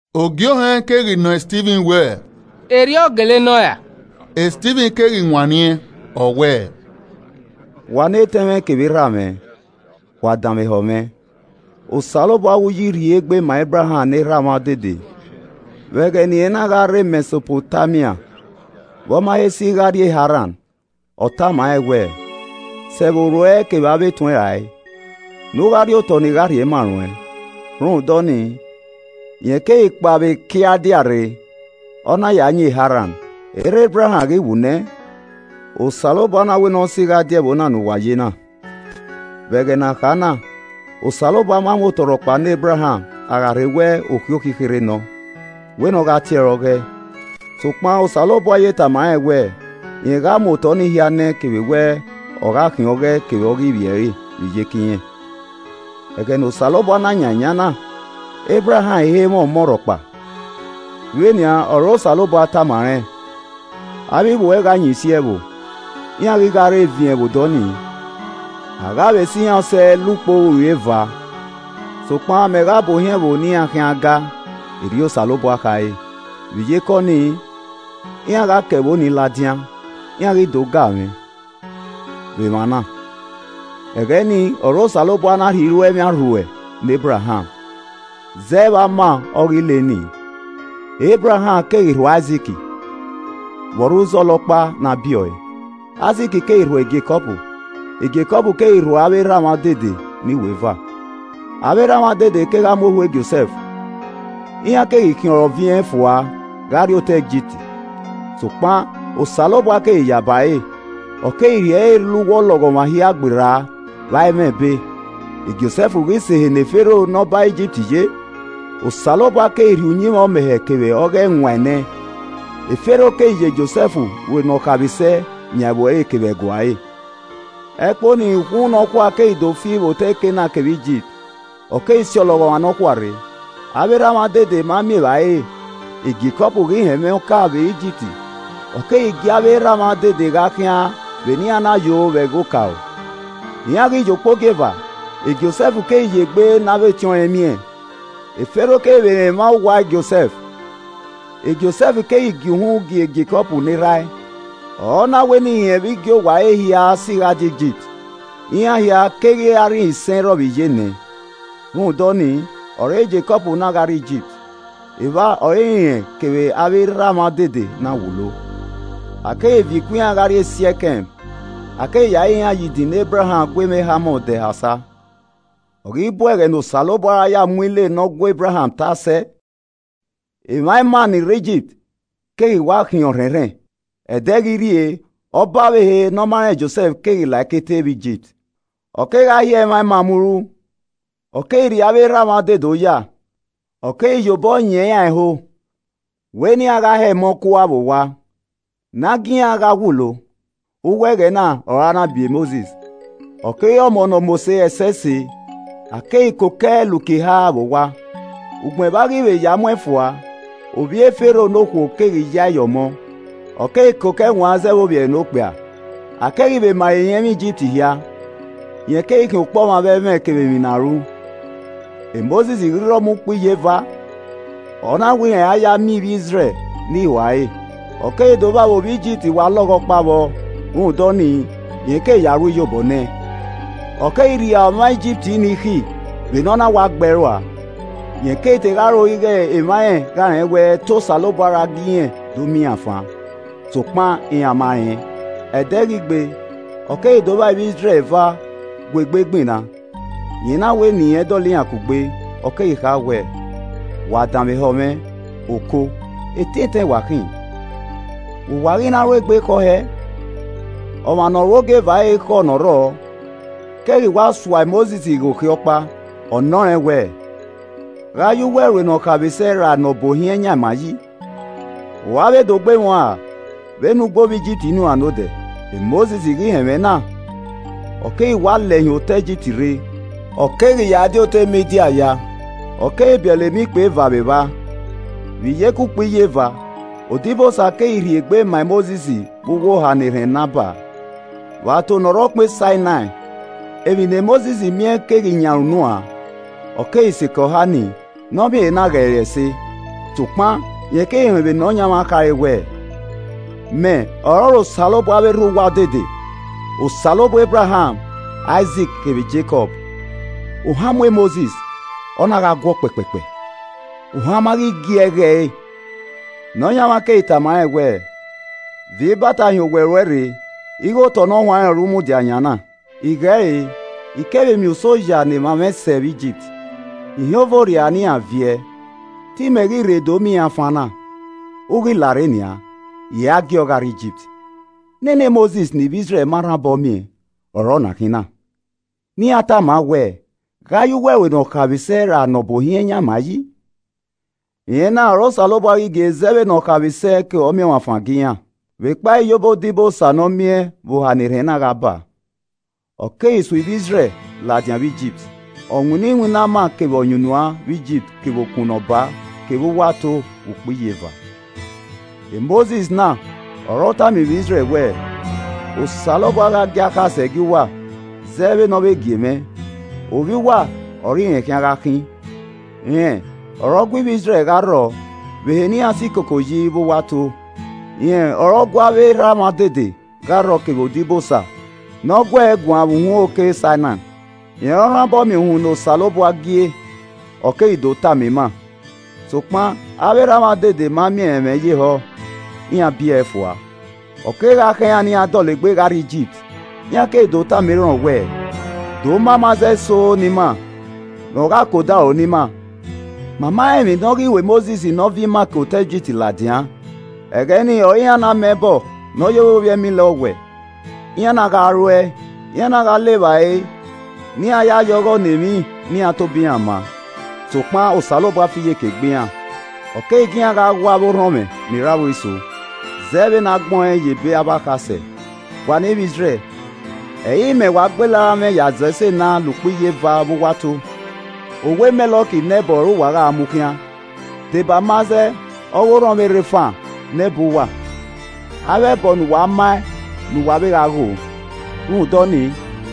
Ogie Ohẹn keghi nọ Stivin wẹẹ, “Erriọ gele nọ ra?” Stivin keghi wanniẹn, ọ wẹẹ, “Wa ne etẹn mwẹ kevbe erha mwẹ, wa danmwehọ mwẹ. Osanobua ọghe uyi rhie egbe ma Ebraham ne erha mwa odede vbe ẹghẹ ne irẹn na gha rre Mẹsopotamia, vbe ọ ma he si gha rrie Haran. Ọ tama rẹn wẹẹ, ‘Sẹ ẹvbo ruẹ kevbe avbe etuẹn rae, ne u gha rrie otọ ne I gha rhie ma ruẹn.’ Rhunmwuda ọnii, rẹn keghi kpao vbe Kialdia rre, ọ na ya yin Haran. Erha Ebraham ghi wu nẹ, Osanobua na wẹ ne ọ si gha die ẹvbo na ne uwa ye na. Vbe ẹghẹ ne a kha na, Osanobua ma mu otọ rhọkpa ne Ebraham, a gha rhe wẹ okhiokhi kherhe nọ, wẹ ne ọ gha tie ẹre ọghọe. Sokpan Osanobua ye tama rẹn wẹ, rẹn gha mu otọe ni hia nẹẹn kevbe wẹ ọ gha khian ọghọe kevbe ọghe ivbi ẹre vbe iyeke irẹn. Ẹghẹ ne Osanobua na yan eyan na, Ebraham i he mwẹ ọmọ rhọkpa. Vbe nian ọre Osanobua tama rẹn, ‘Avbe ivbi uẹ gha yin isi ẹvbo, iran ghi gha re eviẹn vbe odọ nii, a gha vbe sẹ iran usẹ la ukpo uri eva. Sokpan mẹ gha bu ohiẹn ẹvbo ne iran khian gaa, errriọ Osanobua khare, vbe iyeke ọnii, iran gha ke ẹvbo ni ladian, iran ghi do ga mwẹ, vbe emwa na.’ Ẹghẹ nii ọre Osanobua na rhie iruemwi arhuẹ ne Ebraham, zẹ vbe ama ọghe ile nii. Ebraham keghi rhuẹ Aizik vbe ọ rre uzọla ọkpa ne a biẹ ọe. Aizik keghi rhuẹ Jekọb, Jekọb keghi rhuẹ avbe erha mwa odede ne iweva. “Avbe erha mwa odede kegha mu ohu Josẹf, iran keghi khiẹn ọre ọviẹn fua gha rrie otọ Igipt. Sokpan Osanobua keghi ya ba ẹre. Ọ keghi rhie ẹre la uwu ọlọghọmwa hia gberra vbe a i mwẹ ẹbe. E Josẹf ghi sẹ ehe ne Fero ne ọba Igipt ye, Osanobua keghi rhie uyinmwẹ ọmẹhẹ kevbe ọghe ẹwaẹn nẹẹn. E Fero keghi ya Josẹf ru nọ khaemwisẹ yan ẹvbo ẹre ke ẹguae ẹre. Ẹkpo nii, ukhunmwu nọkhua keghi do fi vbe otọ Kenan kevbe Igipt, ọ keghi si ọlọghọmwa nọkhua rre. Avbe erha mwa odede ma miẹn evbare re. E Jekọb ghi họn ẹmwẹ ọka vbe Igipt, ọ keghi gie avbe erha mwa odede gha khian, vbe ne iran na yo vbe ẹghẹ okaro. Iran ghi yo ukpogieva, Josẹf keghi ye egbe ne avbe etiọnrẹn miẹn. E Fero keghi vbe rẹn emwa owa Josẹf. E Josẹf keghi gie uhunmwu gie Jekọb ne erha ẹe, ọ na wẹ ne irẹn vbe igiowa ẹre hia si gha die Igipt. Iran hia keghi re arhinisẹn-irrọ-vbe-iyenẹ. Rhunmwuda ọnii ọre Jekọb na gha rrie Igipt. Evba ọre rẹn kevbe avbe erha mwa odede na wulo. A keghi viọ ikun iran gha rrie Siẹkẹm, a keghi ya re iran ye idin ne Ebraham gu emwa Hamọ dẹ ha osa. “Ọ ghi bu ẹghẹ ne Osanobua ra ya mu ile ne ọ gu Ebraham ta sẹ, emwa ima ni rre Igipt keghi wa khian ọrhẹnrhẹn. Ẹdẹ ghi rrie, ọba ọvbehe ne ọ ma rẹn Josẹf keghi la ẹkete vbe Igipt. Ọ kegha hiẹ emwa ima muru, Ọ keghi rri avbe erha mwa odede oya, Ọ keghi ye obọ yẹn iran ẹho wẹ ne iran gha hẹ emọ kua vbe owa, ne a gie iran gha wulo. Uwu ẹghẹ na ọre a na biẹ Mosis, ọ keghi re ọmọ ne ọ mose ẹsẹse. A keghi koko ẹe la uki eha vbe owa. Ugbẹn vbe a ghi vbe ya mu ẹn fua, ovbi e Fero ne okhuo keghi ya ẹe ye ọmọ, ọ keghi koko ẹe wan zẹ vbe ovbi ẹre ne okpia. A keghi vbe ma ẹre irẹnmwi Igipt hia. Rẹn keghi khian ọkpọmwa vbe ẹmwẹ kevbe emwi ne a ru. “Mosis ghi rre ọmọ ukpo iyeva, ọ na wẹ rẹn ra ya miẹn ivbi Izrẹl ne ihua ẹre. Ọ keghi do vba vbe ovbi Igipt wa lọghọ ọkpa vbọ. Rhunmwuda ọnii rẹn keghi ya ru iyobọ nẹẹn, ọ keghi rria ọmwa Igipt nii ikhi vbe ne ọ na wa gbe ẹe rua. Rẹn keghi te gha ro ighe emwa irẹn gha rẹn wẹ te Osanobua ra gie irẹn do miẹn iran fan. Sokpan iran ma rẹn. Ẹde ghi gbe ọ keghi do vba ivbi Izrẹl eva gu egbe gbinna, rẹn na wẹ ne irẹn dọlọ iran kugbe, ọ keghi kha wẹẹ, ‘Wa danmwehọ mwẹ, oko, etẹn etẹn wa khin, vbe uwa ghi na ru egbe khọ hẹẹ?’ Ọmwa ne ọ ru ogieva ẹre khọ ne ọ rrọọ keghi wa sua Mosis ghe okhiẹ ọkpa, ọ nọ rẹn wẹẹ, ‘Gha ya uwẹ ru ne ọ khaemwisẹ ra ne ọ bu ohiẹn yan ima yi? U ra vbe do gbe mwẹ uan ra vbene u gbe ovbi Igipt nii uan nodẹ?’ Mosis ghi họn ẹmwẹ na, ọ keghi wa lẹ hin otọe Igipt rre, ọ keghi ya di otọ Midian ya. Ọ keghi biẹlẹ emọ ikpia eva vbe evba. “Vbe iyeke ukpo iyeva, odibosa keghi rhie egbe, ma Mosis vbe uwu oha ne erhẹn na baa, vbe ato ne ọ rre ọkpẹn Sainai. Emwi ne Mosis miẹn keghi yan ẹre unu uan, ọ keghi sikẹ oha ni ne ọ miẹn ehe na ghe ẹre ẹse. Sokpan rẹn keghi họn vbe Nọyaẹnmwa khare wẹẹ, ‘Mẹ ọrọre Osanobua avbe erha uwa odede, Osanobua Ebraham, Aizik kevbe Jekọb.’ Ohan mu Mosis, ọ na gha guọ kpẹkpẹkpẹ, ohan ma ghi gie ẹe ghe ẹre. Nọyaẹnmwa keghi tama rẹn wẹẹ, ‘Viọ ibata hin owẹ ruẹ re ighe otọ ne ọ huanrẹn ọre u mudia yan na. I ghe ẹre, I kevbe miẹn usẹ oya ne emwa mwẹ sẹ vbe Igipt. I họn eve orriara ne iran viẹ, te imẹ ghi rre do miẹn iran fan na. U ghi larre nian, I ra giọ gha rrie Igipt.’ “Nene Mosis ne ivbi Izrẹl ma rhan obọ miẹn ọre ọna khin na. Ne iran tama wẹẹ, ‘Gha ya uwẹ ru ne ọ khaemwisẹ rra ne ọ bu ohiẹn yan ima yi?’ Rẹn na ọre Osanobua ghi gie zẹ vbe ne ọ khaemwisẹ ke ọmiọnmwafan gie iran, vbe kpa iyobọ odibosa ne ọ miẹn vbe oha ne erhẹn na gha baa. Ọ keghi su ivbi Izrẹl ladian vbe Igipt, ọ winna iwinna ama kevbe ọyunnuan vbe Igipt kevbe Okun Ne ọ baa kevbe uwu ato vbe ukpo iyeva. Mosis na ọre ọ tama ivbi Izrẹl wẹẹ, ‘Osanobua gha gie akhasẹ gie uwa zẹ vbene ọ vbe gie mwẹ, ovbi uwa ọre irẹn khian gha khin.’ Rẹn ọre ọ gu ivbi Izrẹl gha rrọọ vbe ehe ne iran si koko yi vbe uwu ato, rẹn ọre ọ gu avbe erha mwa odede gha rrọọ kevbe odibosa ne ọ gu ẹe guan vbe uhunmwu oke Sainai, rẹn ọre ọ rhan obọ miẹn uhunmwu ne Osanobua gie, o keghi do tama ima. “Sokpan avbe erha mwa odede ma miẹn ẹre ẹmwẹ ye ehọ, iran bie ẹe fua, ọ kegha khọn iran ne iran dọlegbe gha rrie Igipt. Iran keghi do tama Errọn wẹẹ, ‘Do ma amazẹ eso ne ima ne ọ gha ke odaro ne ima. Ma ma rẹn emwi ne ọ ghi ru e Mosis ne ọ viọ ima ke otọ Igipt ladian.’ Ẹghẹ nii ọre iran na ma ẹbọ ne ọ ye vbe ovbi ẹmila ọwẹe, iran na gha ruẹe, iran na gha le evbare ne iran ya ye ọghọ ne emwi ne iran tobọ iran ma. Sokpan Osanobua fi iyeke gbe iran, ọ keghi gie iran gha gho avbe orhọnmwẹ ni rre aro iso, zẹ vbene agbẹn ọẹn ye ebe avbe akhasẹ: “ ‘Wa ne ivbi Izrẹl, ẹ i re imẹ wa gbele aranmwẹ ya zọ ese na, la ukpo iyeva vbe uwu ato. Owa Mẹlọk ne ẹbọ ọre uwa gha mu khian, deba amazẹ ọghe orhọnmwẹ Refan ne ẹbọ uwa. Avbe ẹbọ ne uwa maẹn ne uwa vbe gha ghoo. Rhunmwuda ọnii,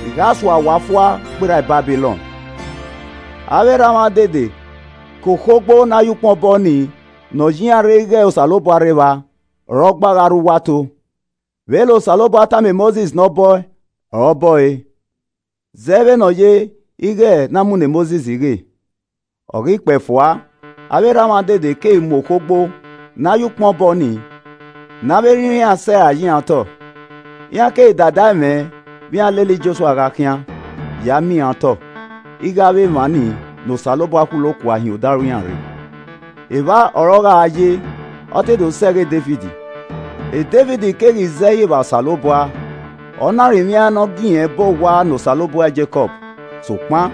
I gha sua uwa fua gberra Babilọn.’ “Avbe erha mwa odede ke okhogbo na ya ukpọn bọ nii ne ọ ye iran rre ighẹ Osanobua rre evba, ọre ogba gha rre uwu ato. Vbene Osanobua tama Mosis ne ọ bọ ẹe ọre ọ bọ ẹe, zẹ vbe ne ọ ye ighẹ ne a mu ne Mosis ghe. Ọ ghi kpẹe fua, avbe erha mwa odede keghi mu okhogbo ne a ya ukpọn bọ nii, ne avbe erha iran sẹ rae ye iran otọ, iran keghi da dae mwẹ vbe iran lele Jọsua gha khian, ya miẹn iran otọ, ighẹ avbe emwa ni ne Osanobua khulo kua hin odaro iran rre. Evba ọre ọ gha ye, ọ te do sẹ ẹghẹ Devid. Devid keghi zẹ ẹhi vba Osanobua, ọna rinmwiaẹn ne ọ gie irẹn bọ owa ne Osanobua Jekọb. Sokpan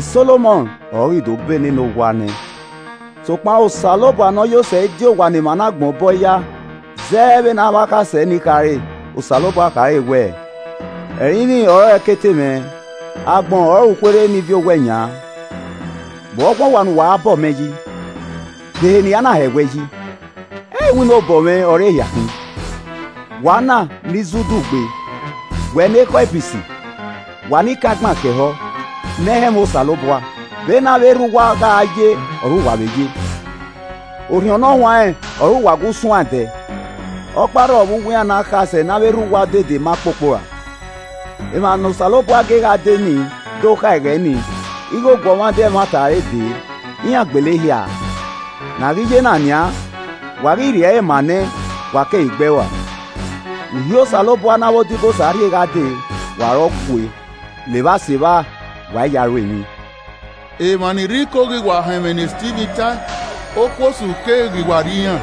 Solomọn ọre ọ ghi do bọ nene owa nẹẹn. “Sokpan Osanobua Nọyosẹ i di owa ne emwa nagbọn bọe ya, zẹ vbene akhasẹ ni khare. Osanobua khare wẹẹ: “ ‘Ẹrinmwi ọrọre ẹkete mwẹ, agbọn ọrọre ukhuerhe ne I viọ owẹ yan. Vbe ọ khun owa ne uwa ra bọ mẹ yi? De ehe ne I na hẹwẹ yi? Ẹ i re iwinna obọ mwẹ ọre ehia khin?’ “Wa na ni zẹ udu gbee! Wẹ ne ekhọe ibisi, wa ni kan igban khiọ ehọ, ne ẹ i họn ẹmwẹ Osanobua. Vbene avbe erha uwa gha ye ọre uwa vbe ye. Orhiọn Ne Ọ Huanrẹn ọre uwa gu suan ẹdẹ. Ọkpa rrọ vbe uwu iran ne akhasẹ ne avbe erha uwa odede ma kpokpo ra? Emwa ne Osanobua gie gha dee ni do kha ẹghẹ ni, ighẹ Ọguọmwadia emwata ẹre dee, iran gbele ehia a, ne a ghi ye na nian, wa ghi rhie ẹre ma an nẹ, wa keghi gbe ẹe rua. Uhi Osanobua ne avbe odibosa rhie gha dee, wa ọre ọ gue, levba sevba, wa i ya ẹe ru emwi.” Emwa ni rre Iko ni ghi wa họn ẹmwẹ ne Stivin ta, okuosu keghi wa rri iran,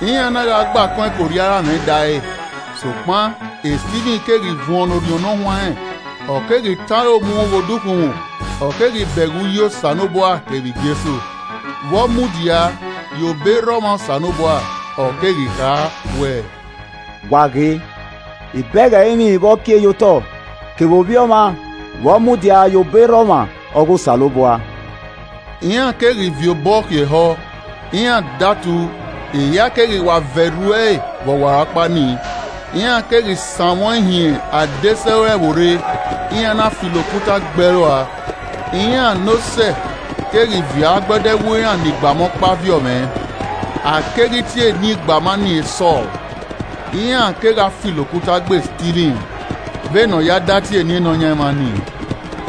iran na gha gbe akọn ẹkorriaramwẹ da ẹre. Sokpan Stivin keghi vuọn ne Orhiọn Ne Ọ Huanrẹn, ọ keghi tọn aro mu ghe odukhunmwu, ọ keghi bẹghe uyi Osanobua, kevbe Jesu, vbe ọ mudia ye obọ erha ọmwa Osanobua. Ọ keghi kha wẹ: “Wa ghe, I bẹghe ẹrinmwi vbe ọ kie ye otọ kevbe Ovbi Ọmwa vbe ọ mudia ye obọ erha ọmwa ọghe Osanobua!” Iran keghi viọ obọ khiọ ehọ, iran datu, ehia keghi wa vẹ rhu ẹe vbe ọwarọkpa ni. Iran keghi sanmwẹ ọẹn hin adesẹ ore ẹvbo rre, iran na filo okuta gbe ẹe rua. Iran ne osẹe keghi viọ agbada ẹwu iran ne igbama ọkpa viọ mwẹ, a keghi tie eni igbama nii Sọl. Iran kegha filo okuta gbe Stivin vbe ne ọ ya da tie eni Nọyaẹnmwa nii,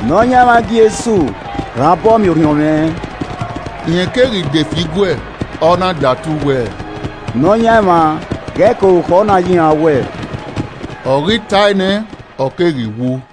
“Nọyaẹnmwa Jesu rhan obọ miẹn orhiọn mwẹ.” Rẹn keghi de fie iguẹ, ọ na datu wẹ, “Nọyaẹnmwa ghẹ ka orukhọ na ye iran owẹ.” Ọ ghi tae nẹ, ọ keghi wu.